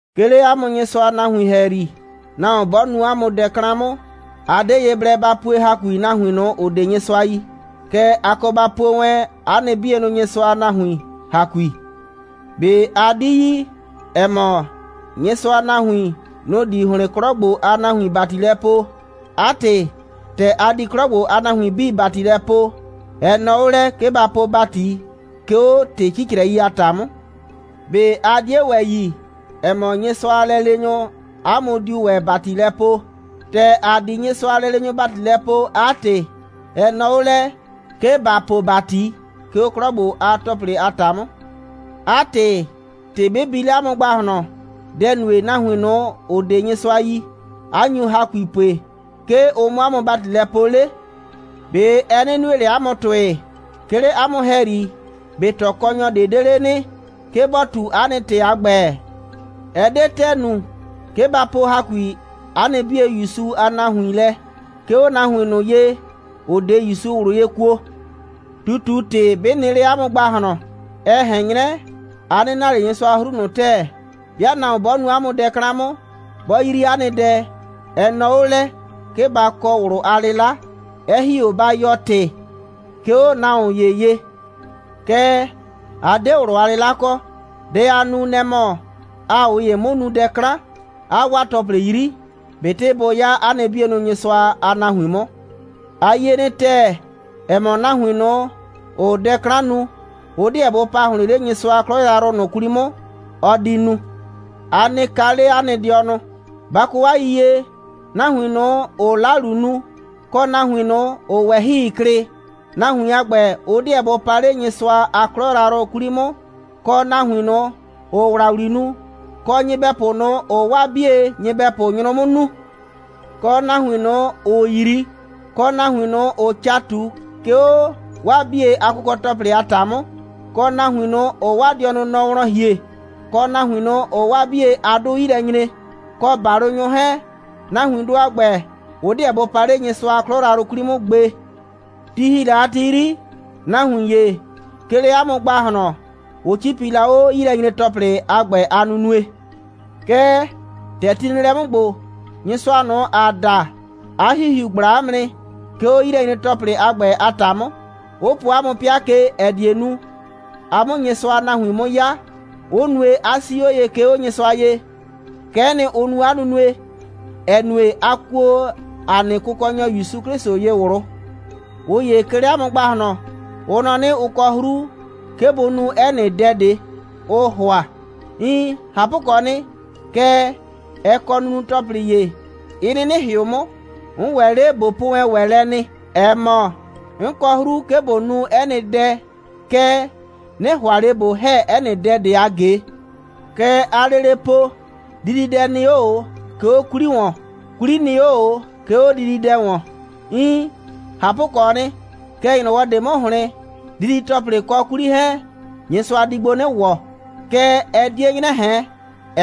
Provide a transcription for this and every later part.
'Ke 'le 'a mʋ Nyɩsʋa a nahuin ‑hɛyri, nahuon 'bɔ nu 'a mʋ dɛ 'klan 'mʋ, a 'de ye blɛ ba pue ‑hakui nahuin ꞊nʋ, ‑ʋ 'de Nyɩsʋa yi. Kɛɛ, a kɔ ba pue wɛn 'a nɩ 'bienʋ Nyɩsʋa a nahuin ‑hakui. ꞊Be a 'di yi, ‑ɛ mɔ, Nyɩsʋa a nahuin, nʋ‑ di ‑hlɩn 'klɔ ‑gbo a nahuin ‑bati lɛ poo? 'A ‑tɩ, ‑tɛ a di 'klɔ ‑gbo a nahuin 'bii ‑bati lɛ poo, ɛ nɔɔ 'o lɛ, 'ke ba po ‑bati, 'ke 'o ‑tɩ 'cicrɛi a ‑ta 'mʋ. ꞊Be a 'die ‑wɛ yi, ‑ɛ mɔ, Nyɩsʋa a lɛleenyʋ, ‑a mʋ diu ‑wɛ ‑bati lɛ poo? ‑Tɛ ‑a di Nyɩsʋa a lɛleenyʋ ‑bati lɛ poo, 'a ‑tɩ, ɛ nɔɔ 'o lɛ, 'ke ‑ba po ‑bati, 'ke 'o 'klɔ ‑gbo a ‑tɔplɩ a ‑ta 'mʋ. 'A ‑tɩ, ‑tɩ 'bɩ bi 'le 'a mʋ ‑gbahlɔn, dɛ‑ nue, nahuin ꞊nʋ, ‑ʋ 'de Nyɩsʋa yi, 'a nyu ‑hakui pue, 'ke ʋ 'mʋ 'a mʋ ‑bati lɛ poo 'le? ꞊Be ɛ 'nɩ nue ꞊le 'a mʋ ‑tʋɩ? 'Ke 'le 'a mʋ ‑hɛyri, ꞊be ꞊tɔkɔnyɔ ꞊de 'de 'le nɩ, 'ke bɔ ꞊tu 'a nɩ ‑tɩ a ‑gbɛ? Ɛ 'de ‑tɛɛ nu, 'ke ba po ‑hakui 'a nɩ 'bie ‑Yusu a nahuin lɛ, 'ke 'o nahuin ꞊nʋ ye, ‑ʋ 'de ‑Yusu ꞊wlʋ ye kuo. ꞊Tutu‑tɩ, 'bɩ nɩ 'le 'a mʋ ‑gbahlɔn, ɛ ꞊hɛn 'nyrɛ, a 'nɩ na ꞊le Nyɩsʋa a 'hru ꞊nʋ ‑tɛɛ. 'Bɩa nahuon 'bɔ nu 'a mʋ dɛ 'klan 'mʋ, 'bɔ 'yri 'a nɩ dɛ, ɛ nɔɔ 'o lɛ, 'ke ba kɔ ꞊wlʋ a 'lɩla, 'ɛ ‑hi 'o ba yɔɔ ‑tɩ, 'ke 'o nahuon ‑ye ye. Kɛɛ, a 'de ꞊wlʋ a 'lɩla kɔ. Dɛ aa nu, nɛ‑ mɔ, aa ꞊ʋ ‑ye 'mʋ nu dɛ 'klan, 'aa 'waa ‑tɔplɩ 'yri, ꞊betɩ bʋ 'ya 'a nɩ 'bie Nyɩsʋa a nahuin 'mʋ. A yie nɩ ‑tɛɛ, ‑ɛ mɔ, nahuin ꞊nʋ, ‑ʋʋ dɛ 'klan nu, ʋ 'deɛ bʋ pa ‑hlɩn 'le Nyɩsʋa a 'klɔ yrayrʋ ꞊nʋ 'kwli 'mʋ, ɔ di nu. A nɩ kaa 'le 'a nɩ dɩɔnʋ, ba kɔ 'a yiyie, nahuin ꞊nʋ, ‑ʋʋ 'lalu nu, kɔ nahuin ꞊nʋ, ‑ʋʋ ꞊wɛhɩi klɩ, nahuin a ‑gbɛ, ʋ 'deɛ bʋ pa 'le Nyɩsʋa a 'klɔ yrayrʋ 'kwli 'mʋ, kɔ nahuin ꞊nʋ, ‑ʋʋ ‑wlawli nu, kɔ nyɩbɛpʋ ꞊nʋ, ‑ʋʋ 'waa 'bie nyɩbɛpʋ nyrʋ 'mʋ nuu, kɔ nahuin ꞊nʋ, ‑ʋʋ 'yri, kɔ nahuin ꞊nʋ, ‑ʋʋ ca ꞊tu, 'ke 'o 'waa 'bie a kʋkɔ‑tɔplɩ a ‑ta 'mʋ, kɔ nahuin ꞊nʋ, ‑ʋʋ 'waa dɩɔnʋ nɔ wlɔn ‑hie, kɔ nahuin ꞊nʋ, ‑ʋʋ 'waa 'bie a 'dʋ 'yi lɛ nyre, kɔ ‑balʋnyʋ 'hɛɛn, nahuindʋ a ‑gbɛ, ʋ 'deɛ bʋ pa 'le Nyɩsʋa a 'klɔ yrayrʋ 'kwli 'mʋ gbe. Ti ‑hi la a ti 'yri, nahuin ‑ye, 'ke 'le 'a mʋ ‑gbahlɔn, ʋ 'cipi la 'o 'yilɛnyre‑tɔplɩ a ‑gbɛ a nunue. Kɛɛ, ‑tɛ ti nɩ lɛ 'mʋ ‑gbo, Nyɩsʋa ꞊nʋ, ‑aa da, 'a ‑Hihiu ꞊gbla 'a mʋ nɩ, 'ke 'o 'yilɛnyre‑tɔplɩ a ‑gbɛ a ‑ta 'mʋ, 'ʋ po 'a mʋ 'pɩa ke, ‑ɛ die nu, a 'mʋ Nyɩsʋa a nahuin 'mʋ 'ya, 'ʋ nue, 'a 'sii 'o ye, 'ke 'o Nyɩsʋa ye. Kɛ'ɛ nɩ, ʋ nu 'a nunue, ‑ɛ nue, a kuo ‑a nɩ Kʋkɔnyɔ ‑Yusu 'Klɩsʋ ye ꞊wlʋ. ꞊Ʋ ‑ye 'ke 'le 'a mʋ ‑gbahlɔn, ʋ nɔ 'nɩ, ʋ kɔ 'hru, 'ke bʋ nu 'ɛ nɩ dɛ ꞊de, ʋʋ ‑hʋa. Iin, ꞊hapʋkɔɔ nɩ, kɛɛ, ɛ kɔ nunu‑tɔplɩ ‑ye, 'ɩ 'nɩnɩ ‑hɩʋ 'mʋ. 'N ‑wɛ 'le ꞊bo po wɛn ‑wɛ lɛ nɩ, ‑ɛ mɔ, 'n kɔ 'hru, 'ke ꞊bo nu 'ɛ nɩ dɛ, kɛɛ, 'nɩ ‑hʋa ꞊le ꞊bo ‑hɛ 'ɛ nɩ dɛ ꞊de a ꞊ge. Kɛ aa lele po: Dididɛ nɩ 'o ꞊o, 'ke 'o 'kwli ‑wɔn, 'kwli nɩ 'o ꞊o, 'ke 'o dididɛ ‑wɔn. Iin, ꞊hapʋkɔɔ nɩ, kɛɛ, ‑nyrɔwɔ ꞊de 'mʋ ‑hlɩn, didi‑tɔplɩ kɔ 'kwli 'hɛɛn, Nyɩsʋa di gbo 'nɩ ‑wɔ, kɛɛ, ɛ 'die 'nyrɛ ꞊hɛn,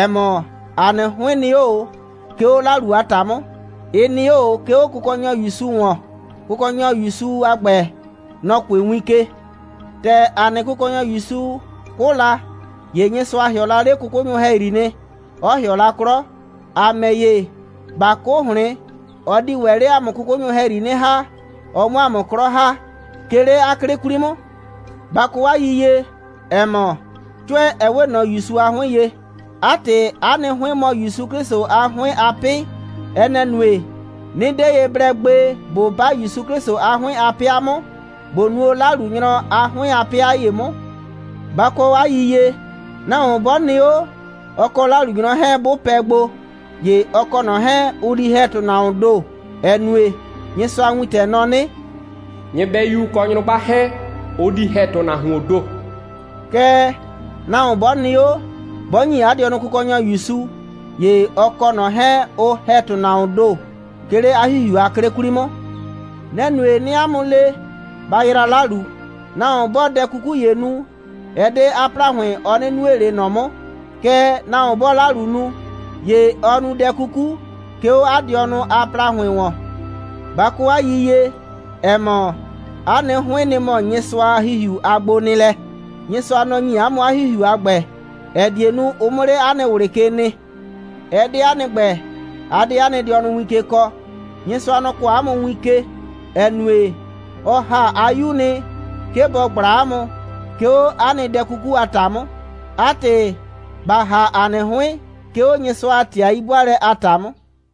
‑ɛ mɔ, ‑a nɩ 'hʋɩn nɩ 'o ꞊o, 'ke 'o 'lalu a ‑ta 'mʋ. Ɩ nɩ 'o ꞊o, 'ke 'o Kʋkɔnyɔ ‑Yusu ‑wɔn. Kʋkɔnyɔ ‑Yusu a ‑gbɛ, nɔ‑ kʋɩ win ke. ‑Tɛ ‑a nɩ Kʋkɔnyɔ ‑Yusu 'kʋ la, ‑ye Nyɩsʋa ‑hɩɔ la 'le 'kʋkʋnyʋ ‑hɛyri nɩ, 'ɔ ‑hɩɔ la 'klɔ. ‑A ‑mɛ ‑ye, ꞊ba 'kʋ ‑hlɩn, ɔ di ‑wɛ 'le ‑a mʋ 'kʋkʋnyʋ ‑hɛyri 'nɩ ‑ha, ɔ 'mʋ 'a mʋ 'klɔ ‑ha, 'ke 'le 'a 'klɩ 'kwli 'mʋ. Ba kɔ 'a yiyie, ‑ɛ mɔ, 'cʋɛ, ɛ 'we ꞊nɔ ‑Yusu a 'hʋɩn ye. 'A ‑tɩ, 'a nɩ 'hʋɩn mɔ ‑Yusu 'Klɩsʋ a 'hʋɩn a 'pɩ. Ɛ nɛ‑ nue, 'nɩ 'de ye blɛ gbe ꞊bo 'ba ‑Yusu 'Klɩsʋ a 'hʋɩn a 'pɩa 'mʋ, ꞊bo nuo 'lalunyrɔ a 'hʋɩn a 'pɩa ‑ye 'mʋ. Ba kɔ 'a yiyie, nahuon 'bɔ nɩ 'o, ɔ kɔ 'lalunyrɔ 'hɛɛn, 'bʋ pɛ gbo, ‑ye ɔ kɔ ꞊nɔ 'hɛɛn, ʋ di ‑hɛ ‑tʋnahuoon ‑do, ‑ɛ nue, Nyɩsʋa a wintɛ nɔ 'nɩ: «Nyɩbɛyu kɔ nyrʋgba 'hɛɛn, ʋ di ‑hɛ ‑tʋnahuoon ‑do.» Kɛɛ, nahuon 'bɔ nɩ 'o, 'bɔ ‑nyi 'a dɩɔnʋ Kʋkɔnyɔ ‑Yusu, ‑ye ɔ kɔ ꞊nɔ 'hɛɛn, ʋ ‑hɛ ‑tʋnahuoon ‑do, 'ke 'le 'a ‑Hihiu a 'klɩ 'kwli 'mʋ. Nɛ‑ nue, 'nɩɩ 'a mʋ le: Ba yraa 'lalu! Nahuon 'bɔɔ dɛ 'kuku ‑ye nu, ɛ 'de 'a ‑plahʋɩn, ɔ 'nɩ nue ꞊le ꞊nɔ 'mʋ. Kɛɛ, nahuon 'bɔɔ 'lalu nu, ‑ye ɔɔ nu dɛ 'kuku, 'ke 'o 'a dɩɔnʋ a ‑plahʋɩn ‑wɔn. Ba kɔ 'a yiyie, ‑ɛ mɔ, 'a nɩ 'hʋɩn, nɩ‑ mɔ Nyɩsʋa a ‑Hihiu a gbonɩɩlɛ? Nyɩsʋa, nɔ‑ ‑nyi 'a mʋ 'a ‑Hihiu a ‑gbɛ, ‑ɛ die nu, ʋ 'mʋ 'le 'a nɩ ꞊wlɩ ke nɩ. Ɛ 'de 'a nɩ ‑gbɛ, a 'de 'a nɩ dɩɔnʋ win ke kɔɔ. Nyɩsʋa, nɔ‑ kɔɔ 'a mʋ win ke, ‑ɛ nue, ɔ ‑ha 'a 'Yu nɩ, 'ke bɔ ꞊gbla 'a mʋ, 'ke 'o 'a nɩ dɛ 'kuku a ‑ta 'mʋ. 'A ‑tɩ, ba ‑ha 'a nɩ 'hʋɩn, 'ke 'o Nyɩsʋa a ‑tɩ a 'yi'bʋaalɛ a ‑ta 'mʋ.